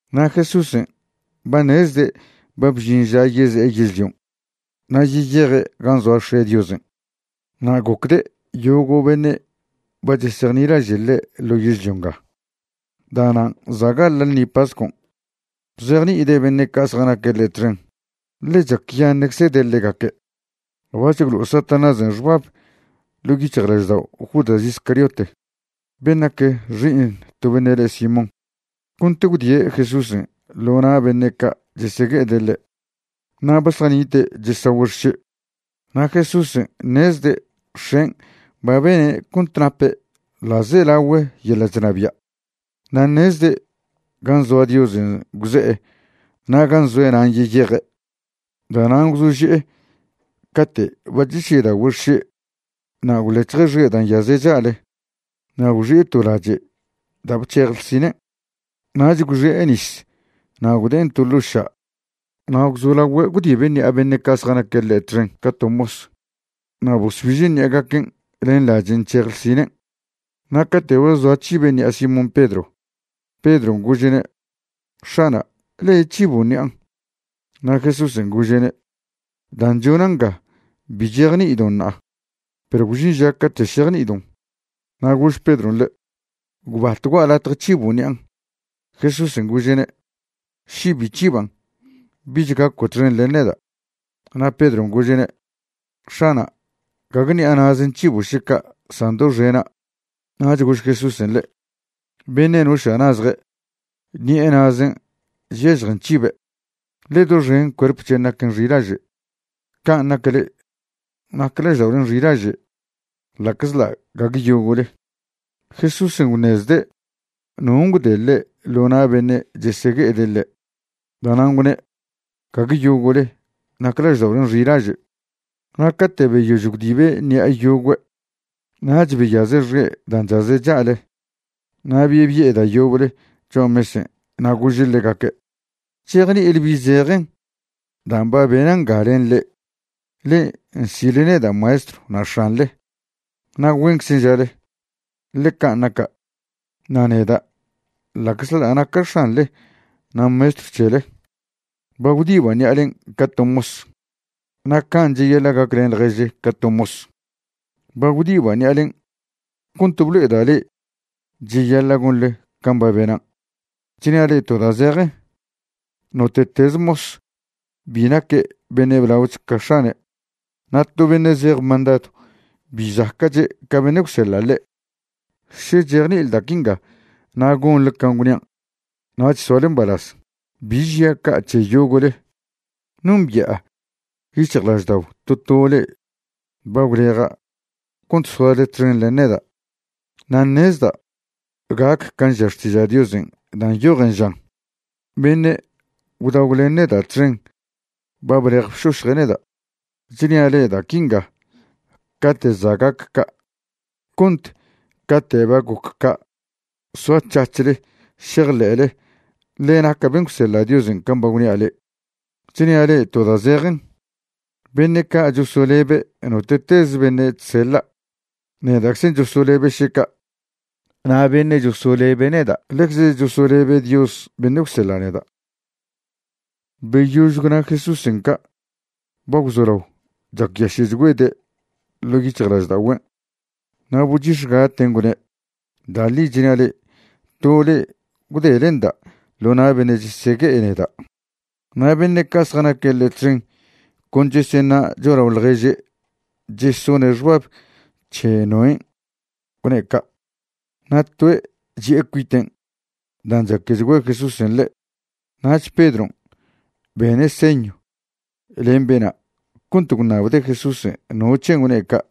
Na' Jesúsen' ba ṉezde' ba bžin ža yeze'e yežlion' na' yeyeje' gan' zoa X̱e' Diosen', na' gocde' yogo' beṉe' ba chejnilaže' ḻe' ḻo yežlio nga. Da'nan' za' gaḻa' ḻṉi pascon' bzejni'ide' beṉe' ca' zjanaque' ḻe' txen, ḻe chacyaṉe'czede' ḻegaque'. Bac̱h gwlo'o Satanásen' xbab ḻo' yic̱hjlaždao' Judas Iscariote, ben' nac xi'iṉ to beṉe' le Simón, cont gwdie' Jesúsen' ḻo na' beṉe' ca' chesegue'ede' ḻe'. Na' ba zjanite' chesagüe' xše'. Na' Jesúsen' ṉezde' X̱en' ba bene' cont nape' ḻa'zelagüe yeḻa' chnabia', na' ṉezde' gan' zoa Diosen' gwze'e na' gan' zoe' nan' yeyeje'. Da'nan' gwzože'e cate' ba chesyedagüe' xše' na' gwlec̱hje' xe' da' nyaze' cha'le na' gwxi'e to lache' da' bc̱hej ḻsinen'. Nach gwxi'e nis na' gwde'en to ḻo' ša' na' gwzolagüe' gwdibe' ṉi'a beṉe' ca' zjanaque' ḻe' txen ca to mos, na' bosbiže' ṉi'agaquen' len lachen' nc̱hej ḻsinen'. Na' cate' ba zoa c̱hibe' ṉi'a Simón Pedro, Pedron' gože'ne': ―X̱ana', ¿le' c̱hibo' ṉi'an'? Na' Jesúsen' gože'ne': ―Dan' chona' nga bi chejni'idon' ṉa'a, perw gwžin ža cate' šejni'idon'. Na' gož Pedron' ḻe': ―Gwbat gua'a latje c̱hibo' ṉi'an'. Jesúsen' gože'ne': ―Še bi c̱hiban', bich gaco' txen len neda'. Na' Pedron' gože'ne': ―X̱ana', gague ṉi'a na'zen' c̱hibo' še ca', san doxena'. Nach gož Jesúsen' ḻe': ―Beṉe' noša' nazje', ṉi'e na'zen' chyažjen c̱hibe', ḻe doxen cuerp c̱hen' naquen xilaže'. Can' nac le'e, nac lažda'olen' xilaže', ḻa'czḻa' gague yogo'le. Jesúsen' gwṉezde' non' gwde' ḻe' ḻo na' beṉe' chesegue'ede' ḻe'. Da'nan' gwne': “Gague yogo'le nac lažda'olen' xilaže.” Na' cate' beyož gwdibe' ṉi'a yogüe', nach beyaze' xe' dan' chaze' cha'le na' bebi'e da' yoble cho'a mesen'. Na' gože' ḻegaque': ―¿Chejni'ile bi zejen dan' ba bena' nga len le'e? Le'e nsi'le neda' Maestrw na' X̱anḻe, na' güenczen' žale, ḻe can' naca'. Na' neda' ḻa'czḻa' naca' X̱anḻe na' Maestrw c̱hele, ba gwdiba' ṉi'alen' ca to mos, na' can' cheyaḻa' gaclen ḻježle ca to mos. Ba gwdiba' ṉi'alen' cont blo'eda' le'e cheyaḻa' gonḻe can' ba benan'. Chnia' le'e to da' zejen, note'teze mos bi naque' beṉe' blaoch ca x̱ane', na' to beṉe' zej mandadw bi zaca'che' ca beṉe' gwseḻa' ḻe'. Še chejni'ile da' quinga na' gonḻe can' gwnian', nach soale mbalaz. ’Bi žia' ca' c̱he yogo'le. Nombi'a yic̱hjlaždao' to to le'e ba gwleja' cont soale txen len neda'. Na' ṉezda' gac can' ža Xtiža' Diosen' da' nyojen žan: “Beṉe' gwdagw len neda' txen ba blej bšošje' neda'.” Chnia' le'e da' quinga cate' za' gac ca' cont cate' ba goc ca' soac̱hac̱hle šejḻe'le ḻe naca' ben' gwseḻa' Diosen' can' ba gwnia' le'e. Chnia' le'e to da' zejen, beṉe' ca' chosolebe' note'tez beṉe' chseḻa', neda'czen' chosolebe' še ca', na' beṉe' chosolebe' neda' ḻecze chosolebe' Dios beṉe' gwseḻe' neda'. Beyož gwna Jesúsen' ca' ba gwzolao chacyaše'chgüede' ḻo' yic̱hjlažda'ogüen', na' bochix̱gaten' gwne': ―Da' ḻi chnia' le'e, to le'e gwdelenda' ḻo na' beṉe' chesegue'e neda'. Na' beṉe' ca' zjanaque' ḻe' txen con cheseṉa' cho'alao ḻježe' chesone' xbab c̱he noen' gwne' ca'. Na' toe' chi'e cuiten' dan' chaquechgüe' Jesúsen' ḻe'. Nach Pedron' bene' señw len bena' cont gwṉabde' Jesúsen' no c̱hen' gwne' ca'.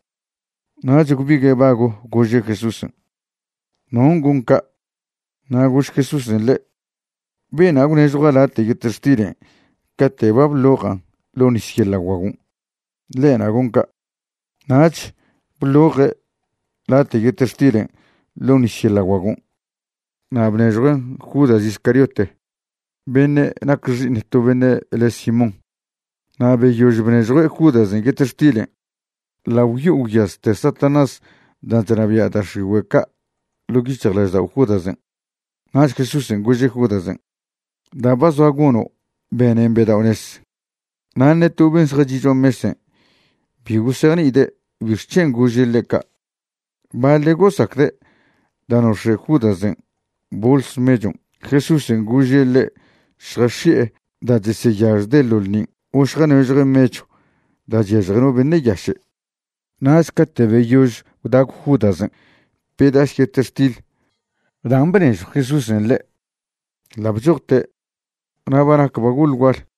Nach gwbigue' bago gože' Jesúsen': ―¿Non' gon ca'? Na' gož Jesúsen' ḻe': ―Bena' gwnežjua' late' yetextilen' cate' ba bḻo'ojan' ḻo' nis yeḻa' guagon', ḻe'na' gon ca'. Nach bḻo'oje' late' yetextilen' ḻo' nis yeḻa' guagon' na' bnežjuen' Judas Iscariote beṉe' nac xi'iṉ to beṉe' le' Simón. Na' beyož bnežjue' Judasen' yetextilen' ḻa' gwyo'o gwyazte Satanás dan' chnabia' da' x̱igüe' ca' ḻo' yic̱hjlaždao' Judasen'. Nach Jesúsen' gože' Judasen': ―Da' ba zoa gono' benen bedao'nez. Na' ṉe to ben' zjachi' cho'a mesen' bi gosejni'ide' bixc̱hen' gože' ḻe' ca'. Baḻe' gosacde' da' nox̱e' Judasen' bols mechon' Jesúsen' gože' ḻe' šjax̱i'e da' cheseyažjde' ḻo ḻṉin' o šjanežjue' mechw da' chyažje no beṉe' yaše'. Nach cate' beyož gwdagw Judasen' pedas yetextil dan' bnežjw Jesúsen' ḻe', ḻa' bchojte'. Na' ba nac ba goḻ gual.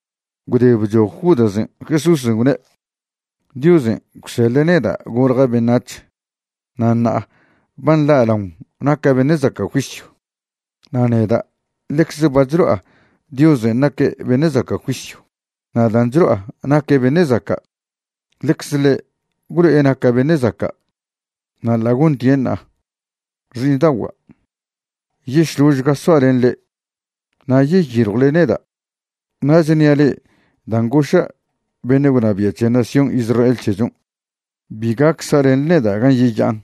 Gwde bchoj Judasen', Jesúsen' gwne': ―Diosen' gwseḻe' neda' golja' beṉac̱h na' ṉa'a ba nḻa'laon naca' beṉe' zaca' juisyw, na' neda' ḻecze ba chlo'a Diosen' naque' beṉe' zaca' juisyw. Na' dan' chlo'a naque' beṉe' zaca', ḻecze ḻe' gwlo'e naca' beṉe' zaca', na' ḻa' gontien' ṉa'a. Xi'iṉda'ogua', yešložga soa' len le'e. Na' yeyiljwle neda', na' chnia' le'e dan' goša' beṉe' gwnabia' c̱he nación Israel c̱hechon', bi gac sa'lenḻe neda' gan' yeya'an.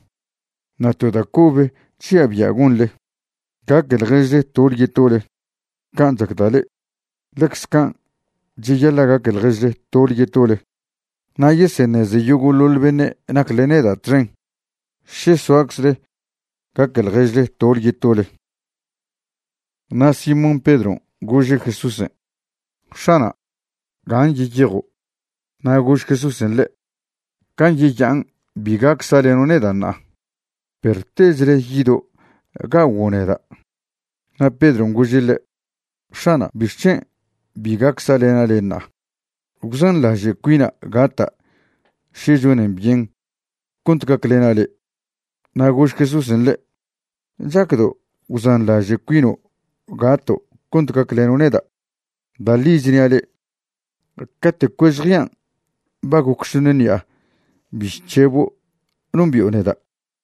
Na' to da' cobe chžia' bia' gonḻe, gaque ḻježle tole yetole. Can' chacda' le'e, ḻecz can' cheyaḻa' gaque ḻježle tole yetole. Na' yeseṉeze yogo'ḻoḻ beṉe' nacle neda' txen še soaczle gaque ḻježle tole yetole. Na' Simón Pedron' gože' Jesúsen': ―X̱ana', ¿gan' yeyejo'? Na' gož Jesúsen' ḻe': ―Gan' yeya'an bi gac sa'leno' neda' ṉa'a, perw techle yido' ga'oguo' neda'. Na' Pedron' gože' ḻe': ―X̱ana', ¿bixc̱hen' bi gac sa'lena' le' ṉa'a? Gwzanḻaže' cuina' gata' še chonen byen cont gaclena' le'. Na' gož Jesúsen' ḻe': ―¿Chacdo' gwzanḻaže' cuino' gato' cont gacleno' neda'? Da' ḻi chnia' le', cate' cuež jean' ba goc šoṉ ṉi'a bi chc̱hebo' nombi'o neda'.